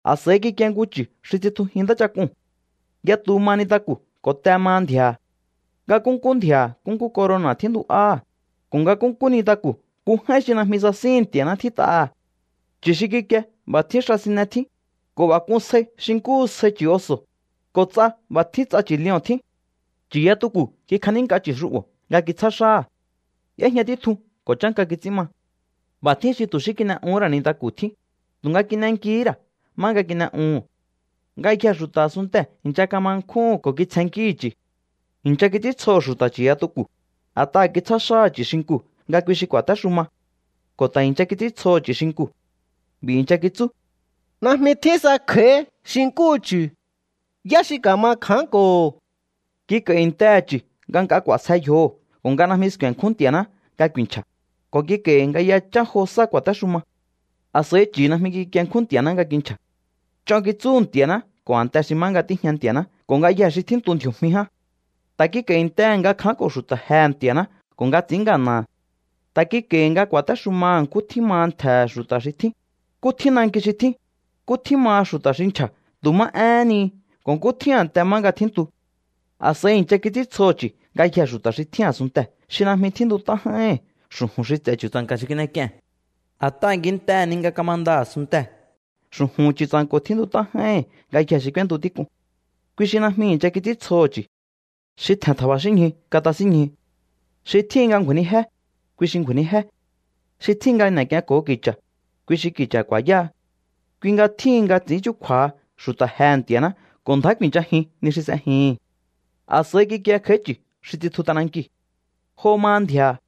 A̱s'a̱i kikie nku chu̱ xi tsitjujín ntáchak'uu̱n. Yatu maha nintaku̱ ko̱ te maha ndji̱a̱ha̱. Nga nkúnkú ndji̱a̱ha̱ nkúnkú corona̱ tjíntu'áha̱, ko̱ nga nkúnkú nintaku̱ nku j'áín xi najmi sasíhi̱n Nti̱a̱ná tjít'aha̱. Chu̱ xi kikie b'a̱ tjín xa sine tjín, ko̱ b'a̱ k'un sjai xi nkúhu sjai chu̱ oso̱, ko̱ ts'a b'a̱ tjín ts'a leo̱n tjín. Chu̱yatuku̱ kikjanínk'a chu̱ xu'bo̱ nga kitsjá xáha̱. Y'éjña títjun ko̱ chánka kits'ín ma. B'a̱ tjín xi tu̱ xí kin'e'uhún ra̱ nku nintaku̱ tjín, tu̱nga kin'enkihí ra̱ má nga kin'e'uhu̱n. Ngayjee̱ xu̱ta̱ a̱sunntee̱ i̱ncha kama nkjúhu̱n ko̱ kitsjennkíhi̱ chu̱. I̱ncha kits'íntsjoho̱ xu̱ta̱ chu̱yatuku̱, a̱t'aha̱ kitsjá xáha̱ chu̱ xinkuu̱ nga kui xi ku̱a̱téxuma. Ko̱ ta̱ i̱ncha kits'íntsjoho̱ chu̱ xinkuu̱. B'i̱ i̱ncha kitsú: —Najmi tjín sa kj'a̱í xi nkúhu chu̱. ¿Yá xi ka̱ma kja̱ánko̱ho̱? Kik'a̱i̱ntehe̱ chu̱ nga nk'a k'u̱a̱sje yjoho̱ ko̱ nga najmi sku̱e̱nkjún Nti̱a̱ná nga ku̱i̱nchja̱, ko̱ kik'a̱i̱hi̱ nga yachán jo sá ku̱a̱téxuma. A̱s'a̱i chu̱ najmi kikienkjún Nti̱a̱ná nga kinchja̱. Ch'on kitsúhu̱ Nti̱a̱ná ko̱ a̱nte xi má nga tíjña Nti̱a̱ná ko̱ ngayjee̱ xi tjíntu ndji̱o̱jmi ján. Ta̱ kik'a̱i̱ntehe̱ nga kja̱ánko̱ xu̱ta̱ jehe̱ Nti̱a̱ná ko̱ nga ts'i̱ín ngana̱ha̱. Ta̱ kik'a̱i̱hi̱ nga ku̱a̱téxumaha̱ nkú tjín maha ntje̱he̱ xu̱ta̱ xi tjín, nkú tjín nanki xi tjín, nkú tjín maha xu̱ta̱ xi nchja̱ tu̱ má éhén ni ko̱ nkú tjín a̱nte má nga tjíntu. A̱s'a̱i i̱ncha kits'íntsjoho̱ chu̱ ngayjee̱ xu̱ta̱ xi tjín a̱sunntee̱ xi najmi tjíntunt'á j'áíhi̱n xu̱ju̱n xi ts'e̱ Chu̱tsa̱nka̱ xi kin'ek'ie̱n. A̱t'aha̱ kintehe̱ ni nga kamanda a̱sunntee̱ xu̱ju̱hu̱n Chu̱tsa̱nko̱ tjíntut'á j'áíhi̱n ngayjee̱ xi k'úéntu tík'uu̱n. Kui xi najmi i̱ncha kits'íntsjoho̱ chu̱. Xi tje̱n tja̱ba̱xínñju katasínñju. Xi tjíhin nga ngju̱a̱i̱nijé, kui xi ngju̱a̱i̱nijé. Xi tjíhin nga n'e̱k'ienko̱ho ki̱cha̱, kui xi ki̱cha̱ ku̱a̱yáha. Kui nga tjíhin nga ts'i̱ín chúkju̱a̱ha xu̱ta̱ jehe̱ Nti̱a̱ná ko̱ ndjá ku̱i̱nchajin ni xi s'ejihi̱n. A̱s'a̱i kikie kj'a̱í chu̱ xi tsitju t'anankiu̱. Jo maha ndji̱a̱ha̱.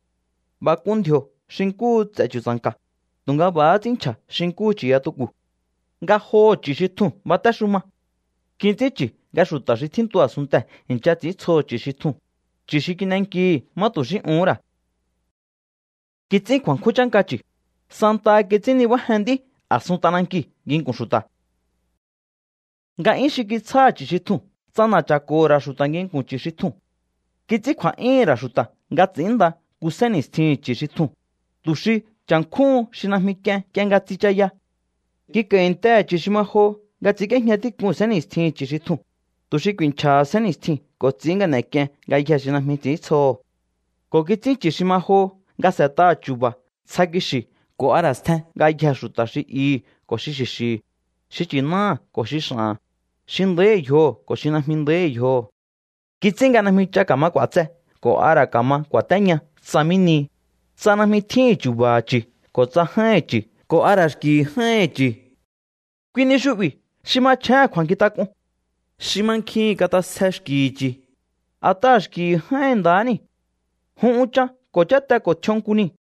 B'a̱ k'un ndji̱o̱ xi nkúhu ts'e̱ chu̱tsa̱nka̱, tu̱nga b'a̱há ts'ín nchja̱ xi nkúhu chu̱yatuku̱. Ngajoho̱ chu̱ xi tjuu̱n batéxuma. Kits'ín chi̱ nga xu̱ta̱ xi tjíntu a̱sunntee̱ i̱ncha ts'i̱íntsjoho̱ chu̱ xi tjuu̱n, chu̱ xi kin'enkihi̱ má tu̱ xí uhún ra̱. Kits'ín kju̱a̱nkjún chánka chi̱, santaha kits'ín nibájen nd'í a̱sun t'anankiu̱ nginku̱n xu̱ta̱. Nga'yún xi kitsjáha̱ chu̱ xi tjuu̱n ts'ana̱cha̱ko̱ho̱ ra̱ xu̱ta̱ nginku̱n chu̱ xi tjuu̱n. Kits'ín kju̱a̱'yúhu̱n ra̱ xu̱ta̱ nga ts'i̱ínnda nku sénni̱stjihi̱n chu̱ xi tjuu̱n, tu̱ xi cha̱nkjúhun xi najmi k'ien nk'ie nga tsichaya. Kik'a̱i̱ntehe̱ chu̱ xi ma joho nga ts'i̱ínk'íéjña tík'un sénni̱stjihi̱n chu̱ xi tjuu̱n, tu̱ xi ku̱i̱nchja̱ha sénni̱stjiu̱n ko̱ ts'i̱ín nga n'e̱k'ien ngayjee̱ xi najmi ts'i̱íntsjoho̱. Ko̱ kits'ín chu̱ xi ma joho nga s'e̱t'aha̱ chu̱ba̱ ntsja kixi̱ ko̱ a ra̱ stjen ngayjee̱ xu̱ta̱, xi ihi̱ ko̱ xi xi̱xi̱hi̱, xi nchi̱náha̱ ko̱ xi x'a̱ha̱n, xi nda̱íhi̱ yjoho̱ ko̱ xi najmi nda̱íhi̱ yjoho̱. Kits'ín nga najmi ch'a ka̱ma k'u̱a̱tse ko̱ a ra̱ ka̱ma ku̱a̱téña tsa mí nihi, tsa najmi tjíhi̱n chu̱ba̱ha̱ chu̱ ko̱ tsa j'áíhi̱n chu̱ ko̱ a ra̱ xki̱hi̱ j'áíhi̱n chu̱. Kui ni xu'bi̱ xi machjéhe̱n kju̱a̱nkjintak'un. Xi mankjihi̱n kat'asje xki̱hi̱ chu̱, a̱t'aha̱ xki̱hi̱ j'áíhi̱n nda̱há niu̱. Jun unchan ko̱ cháte ko̱ tj'ion nku niu̱.